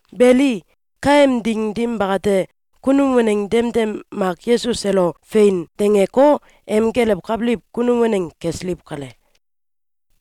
Beli, kaem ding dim bakate, kunum waneng demdem mak Yesus elo “Fein!”, dangeko, em gelewkabiliw kunum waneng kesiliw kale.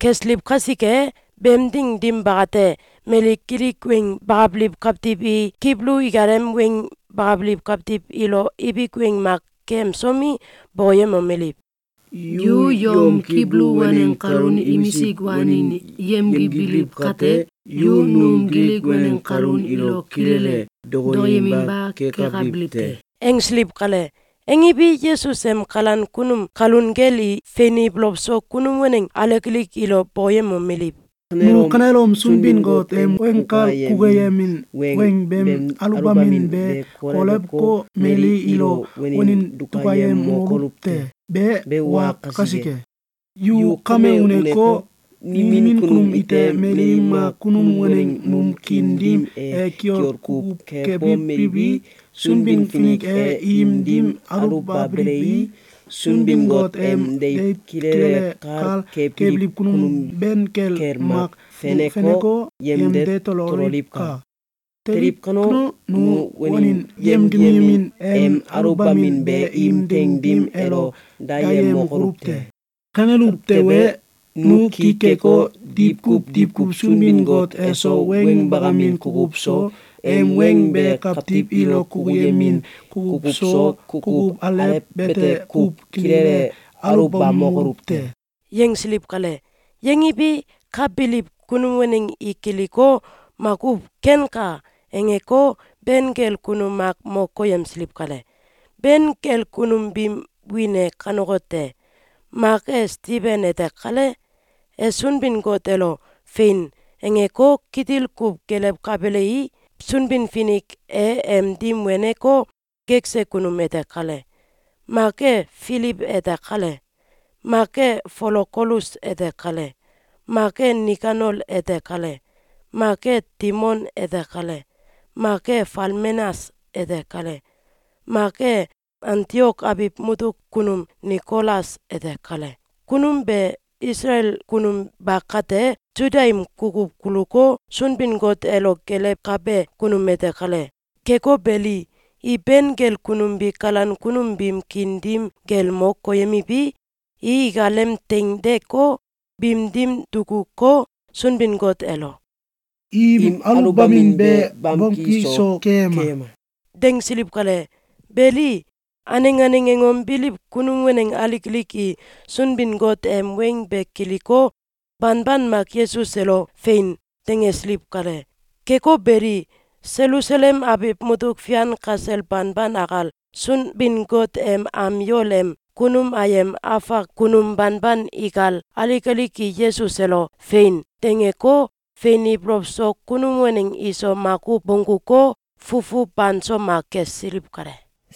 Kesiliw kasike, beem ding dim bakate, mali Gilik weng bakabiliw kawtiw i Kibulu ikalem weng bakabiliw kawtiw ilo ibik weng mak keyemsomi, bokoyemomeliw: “Yu yom Kibulu waneng kalun imisik wanin yemgibiliw kate, yu num Gilik waneng kalun ilo kilele dokoyeminba kekabiliw te!”, angsiliw kale. Angiwi, Yesus em kalan kunum kalun kel i fein ibolow so kunum waneng alik alik ilo bokoyemomeliw: “Nu kanelom Sunbin-Got em weng kal kukuyemin weng beem aluwbamin be kolewko, mali ilo wanin dukayemokoluw te! Be wa kasike, yu kame uneko, nimin kunum ite mali mak kunum waneng num kiin dim e kiol kuw kebomeliwi, Sunbin-Finik e im dim aluwbabelei, Sunbin-Got em deiw kilele kal kebiliw kunum ben kel mak feneko, yemde tololiwka! Teliw kano, nu wanin yemgiyemin em aluwbamin be im teing dim elo dayemokoluw te. Kaneluw tewe, nu ki keko, diwkuw diwkuw Sunbin-Got eso weng bakamin kukuw so, em weng be kawtiw ilo kukuyemin kukuw so, kukuw alew bete kuw kilele aluwbamokoluw te.”, yangsiliw kale. Yangiwi, ka biliw kunum waneng i kiliko, makuw “Kenka!”, angeko, ben kel kunum mak mo koyemsiliw kale. Ben kel kunum biim wiin e kanekote: Mak e Stiben ete kale. — E Sunbin-Got elo “Fein!”, angeko, kitil kuw gelewkabelei, Sunbin-Finik e em dim weneko, gekse kunum ete kale. Mak e Filiw ete kale. Mak e Folokolus ete kale. Mak e Nikanol ete kale. Mak e Timon ete kale. Mak e Falmenas ete kale. Mak e Antiok abiw mutuk kunum Nikolas ete kale. — Kunum be Isalael kunum ba kate, Suda im kukuw kuluko, Sunbin-Got elo gelewkabe kunum ete kale. Keko beli, i ben kel kunum bi kalan kunum biim kiin dim kel mo koyemiwi, i ikalem teing deeko, biim dim dukuko, Sunbin-Got elo “Im aluwbamin be bamki so keyema!”, dangsiliw kale. Beli, aneng aneng angom biliw kunum waneng alik alik i Sunbin-Got em weng be kiliko, banban mak Yesus elo “Fein!”, dangesiliw kale. Keko beli, Selusalem abiw mutuk fian kasel banban akal, Sunbin-Got em am yol em kunum ayem afak kunum banban ikal, alik alik i Yesus elo “Fein!”, dangeko, fein ibolow so kunum waneng iso makuw bongguko, fufu banso mak kesiliw kale.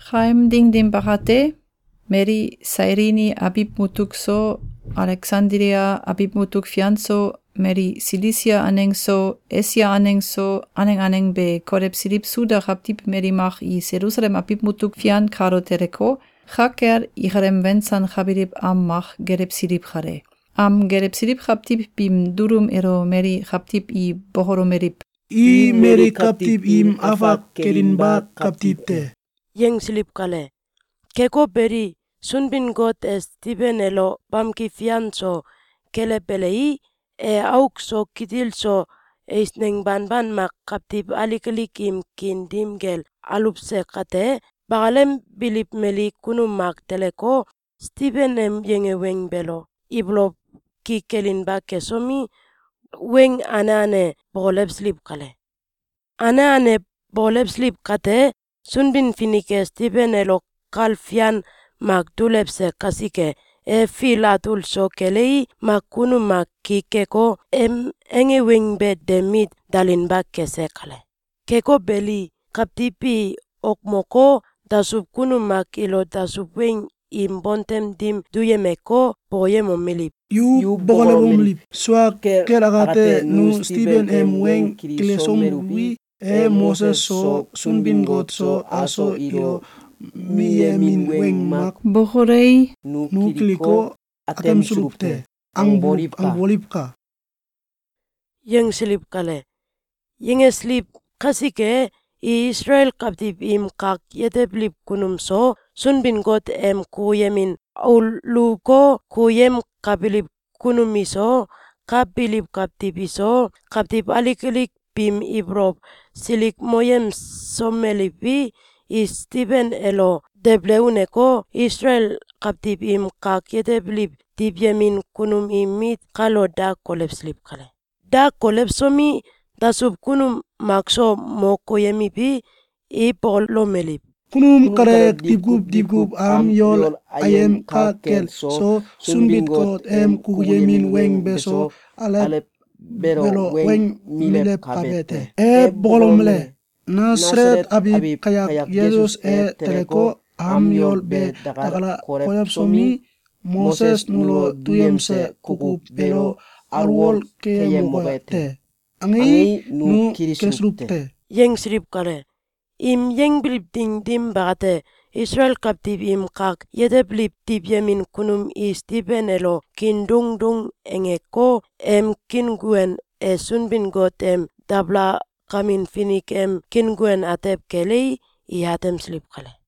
Kaem ding dim bakate, mali Sailini abiw mutuk so, Aleksandilia abiw mutuk fian so, mali Silisia aneng so, Esia aneng so, aneng aneng be kolewsiliw Suda kawtiw mali mak i Selusalem abiw mutuk fian kalo teleko, ka kel ikalem wensankabiliw am mak gelewsiliw kale. Am gelewsiliw kawtiw biim dulum elo mali kawtiw i bokolomeliw: “I mali kawtiw im afak kelinba kawtiw te!”, yangsiliw kale. Keko beli, Sunbin-Got e Stiben elo bamki fian so kelewbelei, e auk so kitil so eisneng banban mak kawtiw alik alik im kiin dim kel aluwse kate, bakalem biliw mali kunum mak teleko, Stiben em yange weng beelo ibolow ki kelinba kesomi, weng ane ane bokolewsiliw kale. Ane ane bokolewsiliw kate, Sunbin-Finik e Stiben elo kal fian mak dulewse kasike, e fil atul so kelei, mak kunum mak ki keko, em ange weng be de mit dalinba kese kale. Keko beli, kawtiw bi okmoko, dasuw kunum mak ilo dasuw weng im bontem dim duyemeko, bokoyemomeliw: “Yu bokolomeliw: ‘Sua kel akate, nu Stiben em weng kilisomeluwi, e Moses so, Sunbin-Got so, aso ilo miyemin weng mak bokolei, nu kiliko, atemsuluw te!’, angboliwka!”, yangsiliw kale. Yangesiliw kasike, i Isalael kawtiw im kak yetebiliw kunum so, Sunbin-Got em kukuyemin auluwko, kukuyemkabiliw kunum iso, ka biliw kawtiw iso, kawtiw alik alik biim ibolow silikmoyemsomeliwi, i Stiben elo debele uneko, Isalael kawtiw im kak yetebiliw diwyemin kunum im mit kalo da kolewsiliw kale. Da kolewsomi, dasuw kunum makso mo koyemiwi, i bokolomeliw: “Kunum kale diwkuw diwkuw am yol ayem ka kel so, Sunbin-Got em kukuyemin weng beso, alew beelo weng milewkabe te. E bokolomele: ‘Nasalet abiw kayak Yesus e teleko, am yol be dakal kolewsomi, Moses nulo duyemse kukuw beelo alwol keyemoke te.’, angei, nu kilisuluw te!”, yangsiliw kale. Im yangbiliw ding dim bakate, Isalael kawtiw im kak yetebiliw diwyemin kunum i Stiben elo kiin doung doung angeko, em kiinguen e Sunbin-Got em dabalakamin finik em kiinguen atew kelei, i atemsiliw kale.